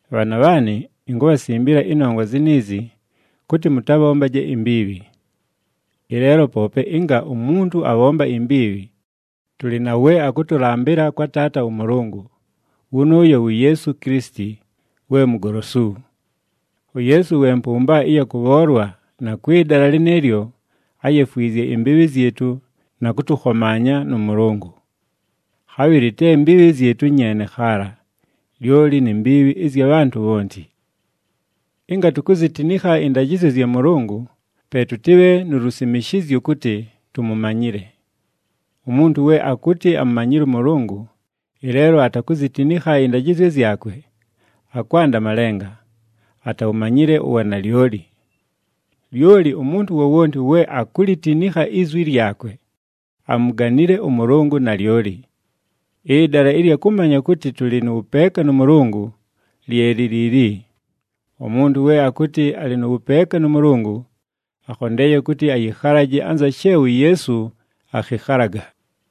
Bhaana bhaanɨ, inkubhasimbila ɨnongwa ziniizi, kʉtɨ mʉtabhombaje imbiibhi. Ɨleelo poope ɨnga umuntu abhomba imbiibhi, tʉlɨ na we akʉtʉlambɨla kwa Taata ʉMʉlʉngʉ, wʉnʉʉyo wu Yeesu Kilisiti, we Mugolosu. UYeesu we mpʉmba ɨya kʉbhoolwa na kwɨ dala lɨnɨɨlyo áyefwizye imbiibhi zyɨtʉ na kʉtʉkhomaanya nʉ Mʉlʉngʉ. Khabhɨlɨ te mbiibhi zyɨtʉ nyeene khaala, lyoli ni mbiibhi ɨzya bhantʉ bhonti. Ɨnga tukuzitinikha ɨndajɨzyo zya Mʉlʉngʉ, pe tʉtɨbhe nu lusimishizyo kʉtɨ tumumanyile. Umuntu we akʉtɨ amumanyile ʉMʉlʉngʉ, ɨleelo atakuzitinikha ɨndajɨzyo zyakwe, akwanda malenga, atawumanyile uwanalyoli. Lyoli umuntu wowonti we akulitinikha izwi lyakwe, amuganile ʉMʉlʉngʉ nalyoli. Ɨdala ɨlya kʉmanya kʉtɨ tʉlɨ nʉ wʉpeeka nʉ Mʉlʉngʉ, lye li liili: umuntu we akʉtɨ alɨ nʉ wʉpeeka nʉ Mʉlʉngʉ, akhondeeye kʉtɨ ayɨkhalaje anza she uYeesu akhɨkhalaga.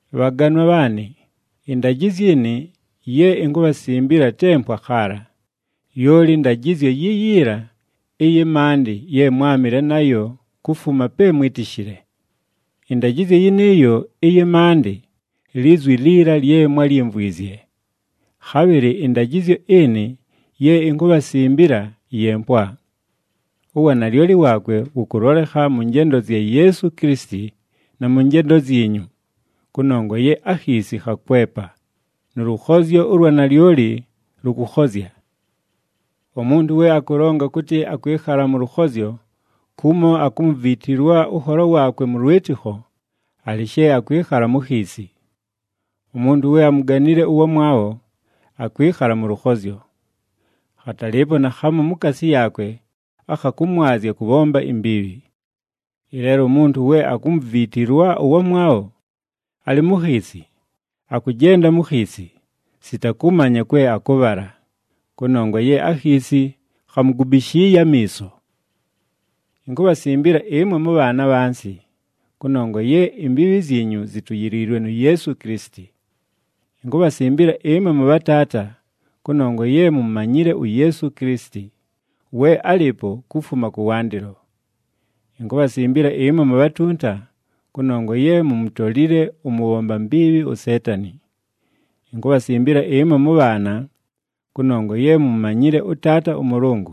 Bhaganwa bhaanɨ, ɨndajɨzyo ɨnɨ ye inkubhasimbila te mpwa khaala, lyoli ndajɨzyo yiyiila ɨyɨ maandɨ ye mwámɨle nayo kufuma pe mwítishile. Ɨndajɨzyo yɨnɨɨyo ɨyɨ maandɨ, lizwi liila lye mwályimvwizye. Khabhɨlɨ ɨndajɨzyo ɨnɨ ye inkubhasimbila, ye mpwa. Uwanalyoli waakwe wʉkʉlolekha mʉ njendo zya Yeesu Kilisiti, na mʉ njendo zyinyu, kʉnongwa ye akhiisi khakwepa, nʉ lʉkhozyo ʉlwa nalyoli lʉkʉkhozya. Umuntu we akʉlonga kʉtɨ akwɨkhala mʉ lʉkhozyo kumo akumuviitilwa ʉnholo waakwe mʉ lwɨtɨkho, alɨ she akwɨkhala mu khiisi. Umuntu we amuganile ʉwamwabho, akwɨkhala mʉ lʉkhozyo. Khatalɨɨpo naakhamu mukaasi yaakwe akha kʉmwazya kʉbhomba imbiibhi. Ɨleelo umuntu we akumuviitilwa ʉwamwabho, alɨ mu khiisi. Akʉjenda mu khiisi, sita kʉmanya kwe akʉbhala, kʉnongwa ye akhiisi khamugubishiiye amiiso. Inkubhasimbila ɨmwe mʉbhaana abhansi, kʉnongwa ye imbiibhi zyinyu zituyiliilwe nu Yeesu Kilisiti. Inkubhasimbila ɨmwe mʉbhataata, kʉnongwa ye mumumanyile uYeesu Kilisiti, we álɨɨpo kufuma kʉwandɨlo. Inkubhasimbila ɨmwe mubhatunta, kʉnongwa ye mumutolile ʉmʉbhomba mbiibhi uSeetani. Inkubhasimbila ɨmwe mʉbhaana, kʉnongwa ye mumumanyile ʉTaata ʉMʉlʉngʉ.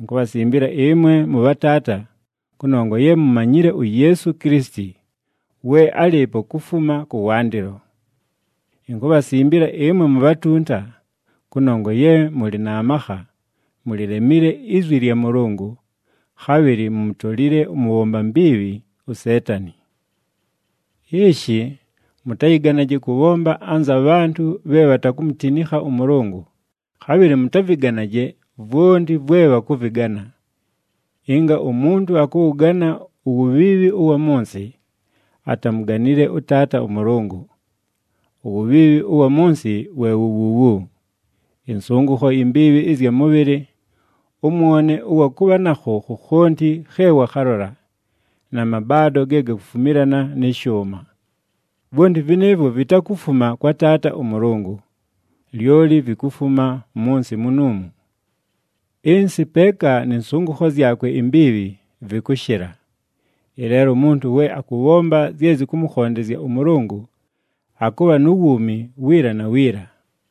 Inkubhasimbila ɨmwe mʉbhataata, kʉnongwa ye mumumanyile uYeesu Kilisiti, we álɨɨpo kufuma kʉwandɨlo. Inkubhasimbila ɨmwe mubhatunta, kʉnongwa ye mʉlɨ na makha, mulilemile izwi lya Mʉlʉngʉ, khabhɨlɨ mumutolile ʉmʉbhomba mbiibhi uSeetani. Ishi, mʉtayɨganaje kʉbhomba anza bhantʉ bhe bhatakumutinikha ʉMʉlʉngʉ, khabhɨlɨ mʉtavɨganaje vwonti vwe bhakʉvɨgana. Ɨnga umuntu akʉwʉgana uwubhiibhi ʉwa mʉ nsɨ, atamuganile ʉTaata ʉMʉlʉngʉ. Uwubhiibhi ʉwa mʉ nsɨ we wu wuuwu: ɨnsʉngʉkho imbiibhi ɨzya mʉbhɨlɨ, ʉmwone ʉwa kʉbha nakho khokhonti khe wakhalola, na mabaado ge gakufumilana nɨ shʉʉma. Vwonti vɨnɨɨvwo vitakufuma kwa Taata ʉMʉlʉngʉ, lyoli vikufuma mʉ nsɨ munuumu. Ɨnsɨ peeka nɨ nsʉngʉkho zyakwe imbiibhi, vɨkʉshɨla. Ɨleelo umuntu we akʉbhomba zye zɨkʉmʉkhondezya ʉMʉlʉngʉ, akʉbha nu wuumi wiila na wiila.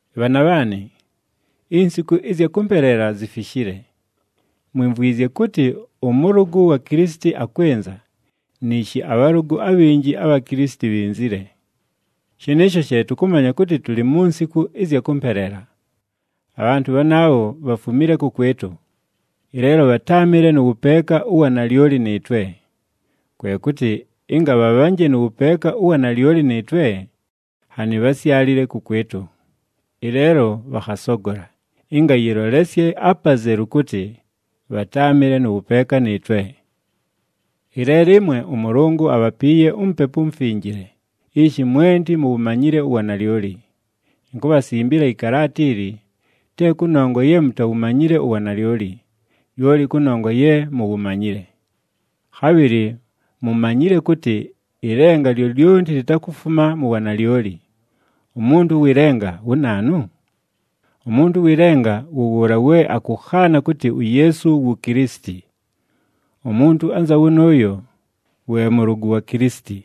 Bhaana bhaanɨ, insiku ɨzya kʉmpeleela zifishile! Mwimvwizye kʉtɨ ʉmʉlʉgʉ wa Kilisiti akwɨnza, niishi abhalʉgʉ abhinji abha Kilisiti bhinzile. Shɨnɨɨsho she tʉkʉmanya kʉtɨ tʉlɨ mu nsiku ɨzya kʉmpeleela. Abhantʉ bhanaabho bhafumile kʉkwɨtʉ, ɨleelo bhatáamɨle nʉ wʉpeeka ʉwa nalyoli nɨɨtwe. Kwe kʉtɨ ɨnga bhabhanje nʉ wʉpeeka ʉwa nalyoli nɨɨtwe, nhanɨ bhásyalile kʉkwɨtʉ. Ɨleelo bhakhasogola, ɨnga yɨlolesye apazelu kʉtɨ bhatáamɨle nʉ wʉpeeka nɨɨtwe. Ɨleelo ɨmwe ʉMʉlʉngʉ abhapiiye uMupepu uMufinjile, ishi mwenti muwumanyile uwanalyoli. Inkubhasimbila ɨkalaata ili, te kʉnongwa ye mutawumanyile uwanalyoli, lyoli kʉnongwa ye muwumanyile. Khabhɨlɨ mumanyile kʉtɨ ɨlenga lyolyonti litakufuma mu wanalyoli. Umuntu ʉwɨ lenga wu naanu? Umuntu ʉwɨ lenga wʉ wʉʉla we akʉkhaana kʉtɨ uYeesu wu Kilisiti. Umuntu anza wʉnʉʉyo, we mʉlʉgʉ wa Kilisiti,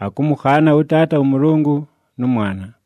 akʉmʉkhaana ʉTaata ʉMʉlʉngʉ nʉ Mwana.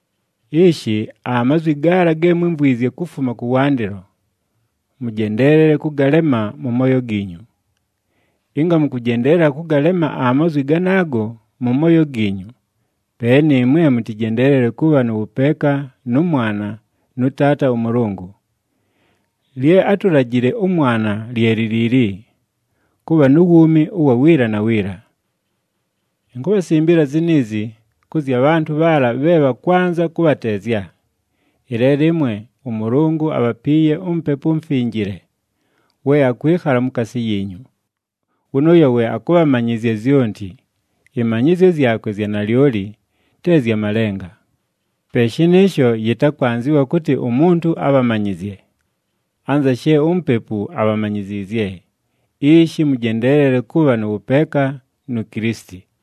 Ishi, amazwi gaala ge mwímvwizye kufuma kʉwandɨlo, mʉjendeelele kʉgalema mʉ mooyo giinyu. Ɨnga mʉkʉjendeelela kʉgalema amazwi ganaago mʉ mooyo giinyu, pe nɨɨmwe mʉtɨjendeelele kʉbha nʉ wʉpeeka nʉ Mwana, nʉ Taata ʉMʉlʉngʉ. Lye átulajile ʉMwana lye li liili, kʉbha nu wuumi ʉwa wiila na wiila. Inkubhasimbila ziniizi, kʉ zya bhantʉ bhaala bhe bhakwanza kʉbhateezya. Ɨleelo ɨmwe, ʉMʉlʉngʉ abhapiiye uMupepu uMufinjile, we akwɨkhala mukaasi yiinyu. Wʉnʉʉyo we akʉbhamanyɨzya zyonti, ɨmanyɨzyo zyakwe zya nalyoli, te zya malenga. Pe shɨnɨɨsho, yɨtakwanzɨwa kʉtɨ umuntu abhamanyɨzye. Anza she uMupepu abhamanyiziizye, ishi mʉjendeelele kʉbha nʉ wʉpeeka nu Kilisiti.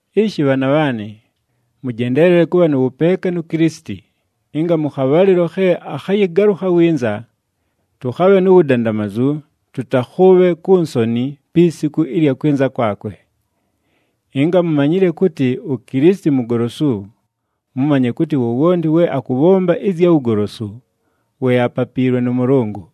Ishi bhaana bhaanɨ, mʉjendeelele kʉbha nʉ wʉpeeka nu Kilisiti, ɨnga mʉ khabhalɨlo khe akhayɨgalʉkha winza, tʉkhabhe nu wudandamazu, tʉtakhʉʉbhe ku nsoni pi siku ɨlya kwɨnza kwakwe. Ɨnga mumanyile kʉtɨ uKilisiti mugolosu, mʉmanye kʉtɨ wowonti we akʉbhomba ɨzya wugolosu, we apapiilwe nʉ Mʉlʉngʉ.